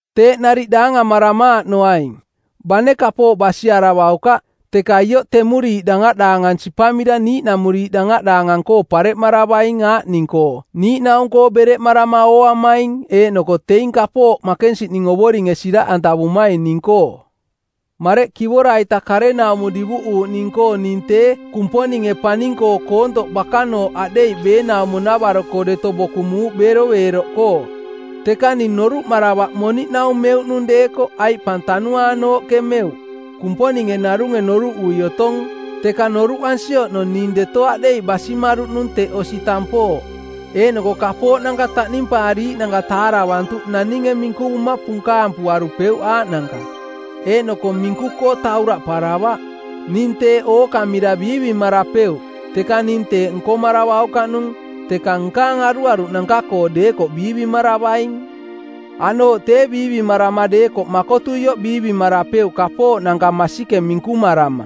Teeꞌ nariꞌ daangamaramaaꞌnoaing. Bane kapooꞌ basiaravaukaꞌ, teka ioꞌ temuriiꞌ dangaꞌdaangang sipamira niiꞌnamuriiꞌ dangaꞌdaangang-koo pareꞌmaravaing aaꞌning-koo niiꞌnaung-koo bereꞌmarama ooamaing eeꞌnoko teing kapooꞌ makensiꞌning Ovoringe siraꞌ antavumaing ning-koo. Mareꞌ kivora-ita karenaumo divuꞌuuꞌning-koo ning tee Kumponinge paning-koo koontoꞌ bakanooꞌ aꞌdeiꞌ beenaumo-navaro-koo deto bokumuuꞌ beroveeroꞌkoo. Teka ning noruꞌmaravaꞌ moniꞌnaung meuꞌnung deekoꞌ aiꞌ pang tanuaanooꞌke meuꞌ. Kumponinge narunge noruꞌui otong. Teka noruꞌansi oꞌnong ning deto aꞌdeiꞌ basimaruꞌnung teꞌ osi tampooꞌ, eeꞌnoko kapooꞌnanka taꞌnimpaariiꞌnanka taaravarantuꞌ naninge minkuvuma punkaam˜ puarupeuꞌ aaꞌnanka, eeꞌnoko minku-koo tauraꞌparavaꞌ. Ning teeꞌ ookamira biivimarapeuꞌ, teka ning teeꞌ nkomaravaukaꞌnung, teka nkaang aruaruꞌnanka-koo deekoꞌ biivimaravaing. Aꞌnooꞌ tee biivimarama deekoꞌ makotuioꞌ biivimarapeuꞌ kapooꞌnanka masikeng minkumarama.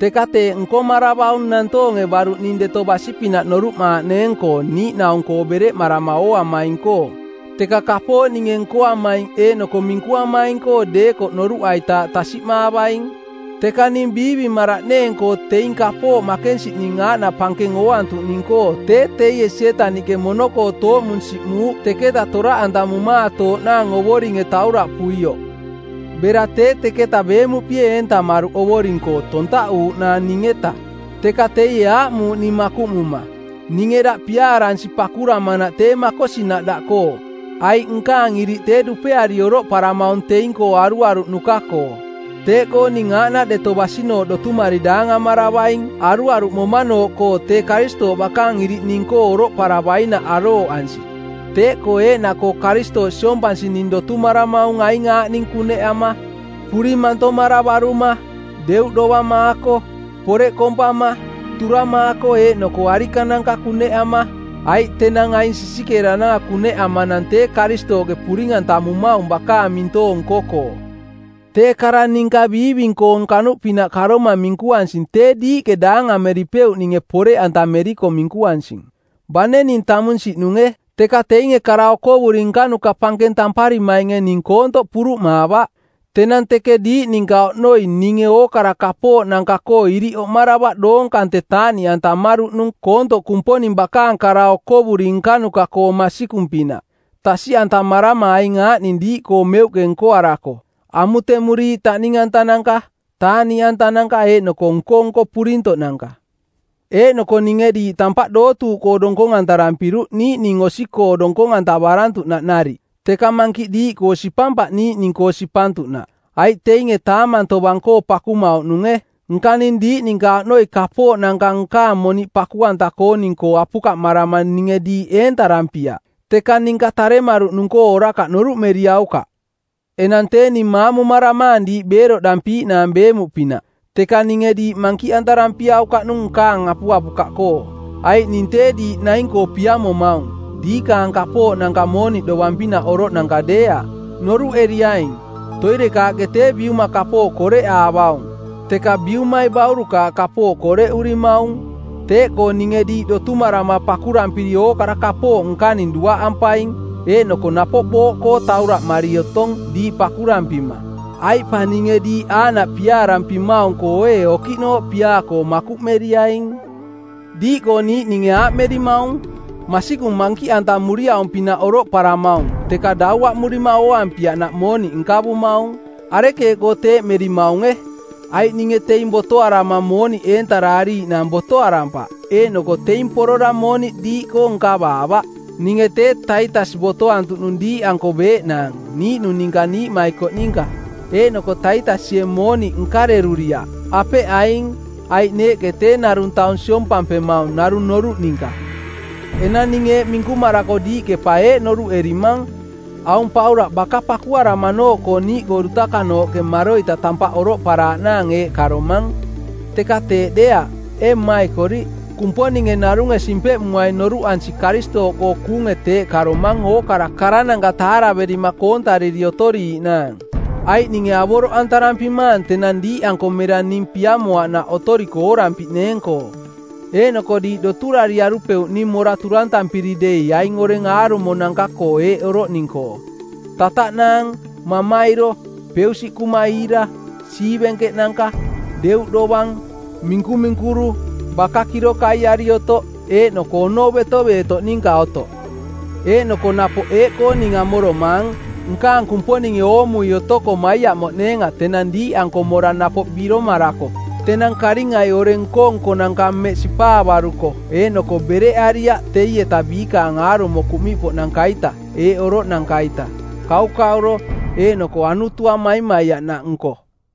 Teka teeꞌ nkomaravaung nantoonge baruꞌ ning deto basi-pinaꞌ noruꞌmaaꞌneeng-koo niiꞌnaung-koo bereꞌmarama ooamaing-koo, teka kapooꞌ ninge nkoamaing eeꞌnoko minkuamaing-koo deekoꞌ noruꞌaitaaꞌ tasiꞌmaavaing. Teka ning biivimaraꞌneeng-koo teing kapooꞌ makensiꞌning aaꞌnaꞌ pankeng ooantuꞌning-koo tee teie Sietaniꞌke mono-koo tooꞌmung siꞌmuuꞌ teketa toraꞌantamumaatooꞌnaang Ovoringe tauraꞌpuioꞌ. Bera tee teketa beemuꞌpie eentamaruꞌ Ovoring-koo tontaꞌuuꞌnaang ning-eta. Teka teie aaꞌmuuꞌ ning makuꞌmuma, “Ninge daꞌ piaaransi pakuramanaꞌ teeꞌ makosinaꞌ daꞌkoo, aiꞌ nkaang iriꞌ tee dupeari oroꞌparamaung teing-koo aruaruꞌnuka-koo.” Teeꞌkoo ning aaꞌnaꞌ deto basinooꞌ dotumari daangamaravaing aruaruꞌmomanooꞌkoo tee Karistooꞌ bakaang iriꞌ ning-koo oroꞌparavainaꞌ arooꞌansi. Teeꞌkoo eeꞌnaꞌkoo Karistooꞌ siompansi ning dotumaramaung aing aaꞌning kuneꞌama: puring mantomaravaruma, deuꞌdovamaako, poreꞌ kompama, turamaako eeꞌnoko arikananka kuneꞌama, aiꞌ tenang aing sisikeerananka kuneꞌamanang tee Karistooꞌke puring-antamumaung bakaang mintoong nko-koo. Tee kara ninka biiving-koong kanuꞌpinaꞌ karoma minkuansing tee diiꞌke daangameripeuꞌninge poreꞌantameriko minkuansing. Bane ning tamunsiꞌnunge, teka teinge kara okovuri nkanuka pankeng tamparimainge ning koontoꞌ puruꞌmaavaꞌ. Tenang teke diiꞌ ninka oꞌnoi ninge ookara kapooꞌnanka-koo iriꞌ oꞌmaravaꞌ doong kante taaꞌniꞌantamaruꞌnung koontoꞌ Kumponing bakaang kara okovuri nkanuka-koong masikung-pinaꞌ, tasiꞌantamarama aing aaꞌning diiꞌkoo meuꞌke nkoarako: amutemuriiꞌ taꞌning-antananka, taaꞌniꞌantananka eeꞌnoko nko-nko purintoꞌnanka. Eeꞌnoko ninge diiꞌ tampaꞌ dootuuꞌkoo donkong-antarampiruꞌ niiꞌning osi-koo donkong-antavarantuꞌnaꞌ nariꞌ, teka mankiꞌ diiꞌkoo sipampaꞌ niiꞌning-koo sipantuꞌnaꞌ, aiꞌ teinge taamang tovang-koo pakumauꞌnunge. Nka ning diiꞌ ninka oꞌnoi kapooꞌnanka nkaang moniꞌ paku-anta-kooning-koo apukaꞌmarama ninge diiꞌ eentarampiaꞌ. Teka ninka taremaruꞌnung-koo orakaꞌ noruꞌmeriaukaꞌ! Enang tee ning maamumaramaang diiꞌ beeroꞌdampiiꞌnaang beemuꞌpinaꞌ, teka ninge diiꞌ mankiꞌantarampiaukaꞌnung nkaang apuapukaꞌkoo, aiꞌ ning tee diiꞌ naing-koo piamomaung, diikaang kapooꞌnanka mooniꞌ dovang-pinaꞌ oroꞌnanka deeaꞌ. Noruꞌeriaing, toirekaaꞌke tee biuma kapooꞌ koreꞌaavaung, teka biumai baurukaaꞌ kapooꞌ koreꞌurimaung. Teeꞌkoo ninge diiꞌ dotumarama pakurampiri ookara kapooꞌ nkaning duaꞌampaing eeꞌnoko napoꞌ booꞌkoo tauraꞌmari otong diiꞌ pakurampima. Aiꞌ pa ninge diiꞌ aaꞌnaꞌ piaarampimaung-koo ee okiꞌnooꞌ piaa-koo makuꞌmeriaing? Diiꞌkoo niiꞌninge aaꞌmerimaung, “Masikung mankiꞌantamuriaung-pinaꞌ oroꞌparamaung, teka dauaꞌmurima ooampiaꞌnaꞌ mooniꞌ nkavumaung.” Arekeeꞌkoo teeꞌmerimaunge? Aiꞌ ninge teing botoarama mooniꞌ eentaraariiꞌnaang botoarampaꞌ eeꞌnoko teing porora mooniꞌ diiꞌkoo nkavaavaꞌ. Ninge tee Taitas botoantuꞌnung diiꞌanko beeꞌnaang, niiꞌnung ninka niiꞌmaikoꞌ ninka. Eeꞌnoko Taitasie mooniꞌ nkareruriaꞌ, apeꞌ aing? Aiꞌ neeꞌke tee narung taung siompampemaung narung noruꞌ ninka. Enang ning eeꞌ minkumarako diiꞌke pa eeꞌ noruꞌmerimang: “Aung Paulaꞌ baka pakuaramanooꞌkoo niiꞌkoo dutakanooꞌke maroita tampaꞌ oroꞌparaaꞌnaang eeꞌ karomang.” Teka teeꞌ deeaꞌ, ee mmaikoriꞌ. Kumponinge narunge simpeꞌmuaing noruꞌansi Karistooꞌkoo kuunge teeꞌ karomang ookara karananka taaraverima koontariri otoriiꞌnaang. Aiꞌ ninge avoroꞌantarampimaang tenang diiꞌanko mera ning piamoaꞌnaꞌ otoriko oorampiꞌneeng-koo, eeꞌnoko diiꞌ doturariarupeuꞌ ning mora turantampiri dei aing oreng aarumonanka-koo eeꞌ oroꞌning-koo: tataꞌnaang, mamairo, peusiꞌkuma iira, siivenkeꞌnanka, deuꞌ dovang, minkuminkuru, baka kirokaiari otoꞌ, eeꞌnoko onou betoveetoꞌ ninka otoꞌ. Eeꞌnoko napoꞌ eeꞌkoo ning amoromaang: nkaang Kumponinge oomui otoko maiaꞌmoꞌneenga tenang diiꞌanko mora napoꞌ biromarako tenang karingai oreng nko-nkonanka mmeꞌ sipaavaruko eeꞌnoko bereꞌariaꞌ teieta biikaang aarumo kuꞌmiꞌpoꞌnanka-ita eeꞌ oroꞌnanka-ita: kaukauro, eeꞌnoko anutua maimaiaꞌnaꞌnko.